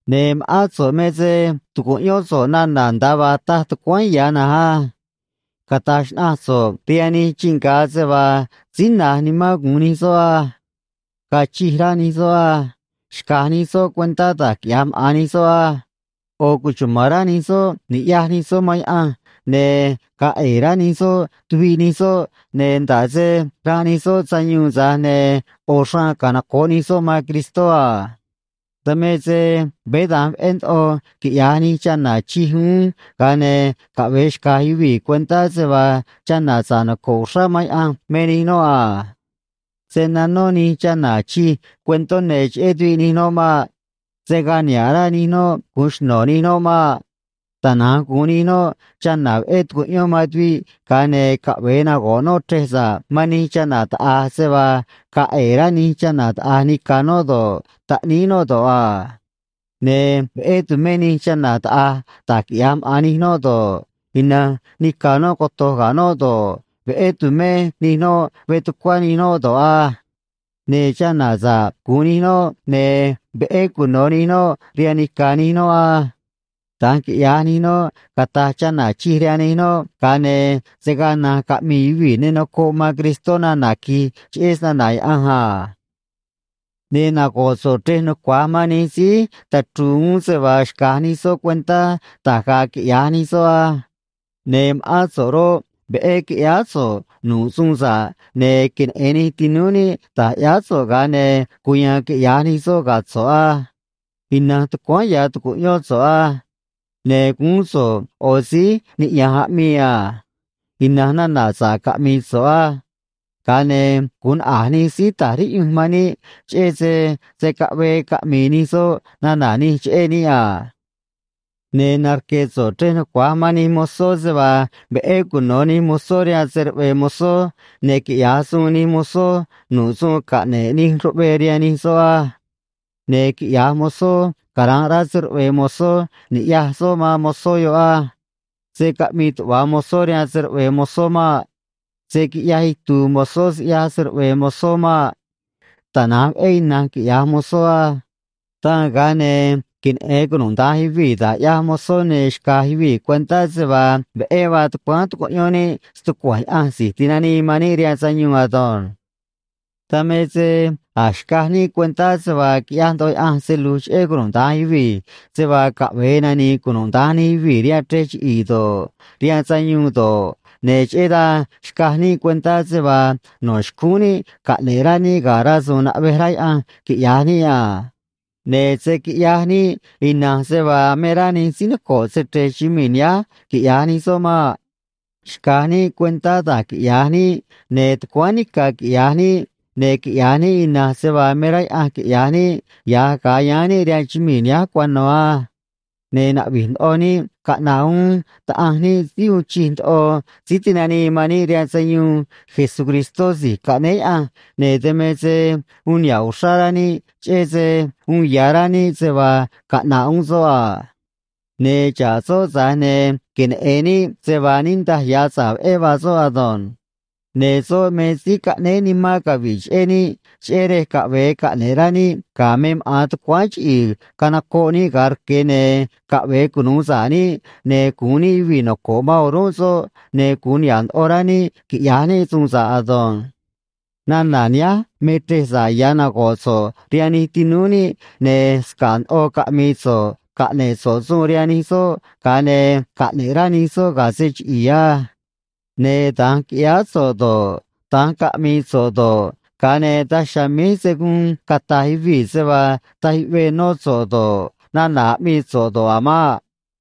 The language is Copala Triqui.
Ne̱ ma̱ꞌán so̱ꞌ me se tu̱cuꞌyón so̱ꞌ nana̱ nda̱a vaa taj tucuáán ya̱ na̱nj á. Cata̱j xnaꞌanj so̱ꞌ rihaan nij chii nga̱ se vaa síí na̱j nimán gu̱un nij soꞌ á. Ga̱a̱ chij rá nij soꞌ á. Xca̱j nij soꞌ cuentá da̱j quiꞌya̱j maꞌa̱n nij soꞌ á. ꞌO̱ cuchuma̱n rá nij soꞌ ni̱ꞌyaj nij soꞌ man Yaꞌanj, ne̱ ga̱a̱ ꞌe̱e̱ rá nij soꞌ tuviꞌ nij soꞌ, ne̱ nda̱ꞌ se ranꞌ nij soꞌ sayuun, tza̱j ne̱ ꞌo̱ xraan canoco̱ꞌ nij soꞌ man Cristó a. Dan me se veé da̱nj veꞌé ndoꞌo quiꞌya̱j nij chana̱ chij uún, ga̱a ne̱ caꞌve̱e xca̱j yuvii̱ cuentá se vaa chana̱ sa̱ꞌ noco̱ꞌ uxrá man Yaꞌanj me nij noꞌ a. Se̱ nanó nij chana̱ chij cuentó ne̱ cheꞌé tuviꞌ nij noꞌ maꞌ. Se̱ gaa niha̱ꞌ rá nij noꞌ gu̱un xno̱ nij noꞌ maꞌ. Tana̱nj gu̱un nij noꞌ chana̱ veꞌé tucuꞌyón man tuviꞌ, ga̱a ne̱ caꞌve̱e nago̱ꞌ noꞌ chrej sa̱ꞌ man nij chana̱ taꞌa̱j se vaa ga̱a̱ ꞌe̱e̱ rá nij chana̱ taꞌa̱j nica̱ noꞌ do̱ꞌ, taꞌníí noꞌ do̱ꞌ a. Ne̱ veꞌé tu̱mé nij chana̱ taꞌa̱j da̱j quiꞌya̱j maꞌa̱n nij noꞌ do̱ꞌ, ina̱nj nica̱ noꞌ coto̱j ga̱ noꞌ do̱ꞌ, veꞌé tu̱mé nij noꞌ veꞌ tucuá nij noꞌ do̱ꞌ á. Ne̱ chana̱ sa̱ꞌ gu̱un nij noꞌ, ne̱ veꞌé cuno̱ nij noꞌ rihaan nica̱ nij noꞌ á. Da̱nj quiꞌya̱j nij noꞌ, cata̱j chana̱ chij rihaan nij noꞌ, ga̱a ne̱ se̱ gaa na̱nj caꞌmi̱i̱ yuvii̱ ne nocoꞌ man Cristó nana̱ qui̱j cheꞌé snana̱ Yaꞌanj a. Ne̱ nago̱ꞌ so̱ꞌ chrej nucua̱j man nij síí tachru̱u̱ uún se vaa xca̱j nij soꞌ cuentá da̱j ga̱a̱ quiꞌya̱j nij soꞌ á. Ne̱ ma̱ꞌán so̱ꞌ roꞌ, veꞌé qui̱ꞌyáá so̱ꞌ nu̱ꞌ suun sa̱ꞌ, ne̱ queneꞌe̱n nij tinúú níꞌ da̱j ꞌyáá so̱ꞌ, ga̱a ne̱ cuya̱a̱n quiꞌya̱j nij soꞌ ga̱ so̱ꞌ á. Ina̱nj tucuáán ya̱ tu̱cuꞌyón so̱ꞌ á. Ne̱ guún so̱ꞌ ꞌo̱ síí niꞌya̱nj aꞌmii a. Ina̱nj nana̱ sa̱ꞌ caꞌmi̱i̱ so̱ꞌ á. Ga̱a ne̱ gu̱un naꞌa̱j nij síí ta̱j riꞌyunj man níꞌ cheꞌé se se̱ caꞌvee caꞌmi̱i̱ nij soꞌ nana̱ nij cheꞌé níꞌ a. Ne̱ narque̱ so̱ꞌ chrej nucua̱j man nij mozó se vaa veꞌé cuno̱ nij mozó rihaan se‑ruꞌve̱e̱ mozó, ne̱ quiꞌya̱j suun nij mozó nu̱ꞌ suun caꞌne̱ꞌ nij ruꞌvee rihaan nij soꞌ á. Ne̱ quiꞌya̱j mozó cara̱nꞌ rá se‑ruꞌve̱e̱ mozó ni̱ꞌyaj soꞌ man mozó yoꞌ á. Se̱ caꞌmii tuꞌva̱ mozó rihaan se‑ruꞌve̱e̱ mozó maꞌ. Se̱ quiꞌyaj itu̱u̱ mozó siꞌyaj se‑ruꞌve̱e̱ mozó maꞌ. Tana̱nj veꞌé ina̱nj quiꞌya̱j mozó á. Dan ga̱a ne̱ queneꞌe̱n cunuda̱nj yuvii̱ da̱j ꞌyaj mozó ne̱ xca̱j yuvii̱ cuentá se vaa veꞌé vaa tucuáán tucuꞌyón níꞌ stucua̱nj Yaꞌanj Si̱j Tinanii man níꞌ rihaan Sayuun ado̱nj. Dan me se a̱j xcaj níꞌ cuentá se vaa quiꞌyaj ndoꞌo Yaꞌanj se lu̱j cheꞌé cunuda̱nj yuvii̱, se vaa caꞌve̱e nani̱i̱ cunuda̱nj nij yuvii̱ rihaan chrej chiꞌi̱i̱ do̱ꞌ, rihaan sayuun do̱ꞌ, ne̱ cheꞌé dan xcaj níꞌ cuentá se vaa no̱ xcúún níꞌ caꞌne̱ꞌ rá níꞌ ga̱ rasu̱u̱n naꞌvej rá Yaꞌanj quiꞌya̱j níꞌ a. Ne̱ se̱ quiꞌyaj níꞌ ina̱nj se vaa me rá nij síí noco̱ꞌ se‑chre̱j chumii̱ nihánj quiꞌya̱j nij soꞌ maꞌ. Xca̱j níꞌ cuentá da̱j quiꞌya̱j níꞌ, ne̱ tucuáán nica̱ quiꞌya̱j níꞌ, ne̱ quiꞌya̱j níꞌ ina̱nj se vaa me rá Yaꞌanj quiꞌya̱j níꞌ ya̱j ga̱a yáán níꞌ rihaan chumii̱ nihánj cuano̱ á. Ne̱ na̱ꞌvi̱j ndoꞌo níꞌ caꞌna̱ꞌ uún Taꞌanj níꞌ síí uun chij ndoꞌo Síí Tinanii man níꞌ rihaan Sayuun, Jesucristó Si̱j Caꞌnéé Yaꞌanj, ne̱ dan me se uun niha̱ꞌ uxrá rá níꞌ cheꞌé se uun ya̱ rá níꞌ se vaa caꞌna̱ꞌ uún soꞌ a. Ne̱ xa̱ꞌ soꞌ, tza̱j ne̱ queneꞌe̱n níꞌ se vaa niꞌndaj ya̱ sa̱ꞌ veꞌé vaa soꞌ ado̱nj. Ne̱ soꞌ me síí caꞌnéé nimán cavi̱ꞌ cheꞌé níꞌ, cheꞌé rej caꞌve̱e caꞌne̱ꞌ rá níꞌ ga̱ me maꞌa̱n tucuáán chiꞌi̱i̱ canocoꞌ níꞌ ga̱a rque̱, ne̱ caꞌve̱e cunu̱u sa̱ꞌ níꞌ, ne̱ gu̱un níꞌ yuvii̱ noco̱ꞌ man o̱rúnꞌ soꞌ, ne̱ gu̱un niha̱ꞌ ndoꞌo rá níꞌ quiꞌya̱j níꞌ suun sa̱ꞌ ado̱nj. Nana̱ nihánj me chrej sa̱ꞌ ya̱ nago̱ꞌ so̱ꞌ rihaan nij tinúú níꞌ, ne̱ sca̱ꞌ ndoꞌo caꞌmi̱i̱ so̱ꞌ, caꞌne̱ꞌ so̱ꞌ suun rihaan nij soꞌ, ga̱a ne̱ caꞌne̱ꞌ rá nij soꞌ ga̱ se chiꞌi̱i̱ á. Ne̱ da̱nj qui̱ꞌyáá so̱ꞌ do̱ꞌ, da̱nj caꞌmi̱i̱ so̱ꞌ do̱ꞌ, ga̱a ne̱ daj chiha̱a̱ míj se̱ guun cata̱j yuvii̱ se vaa taj yuꞌvee nó so̱ꞌ do̱ꞌ, nana̱ aꞌmii so̱ꞌ do̱ꞌ a̱ maꞌ.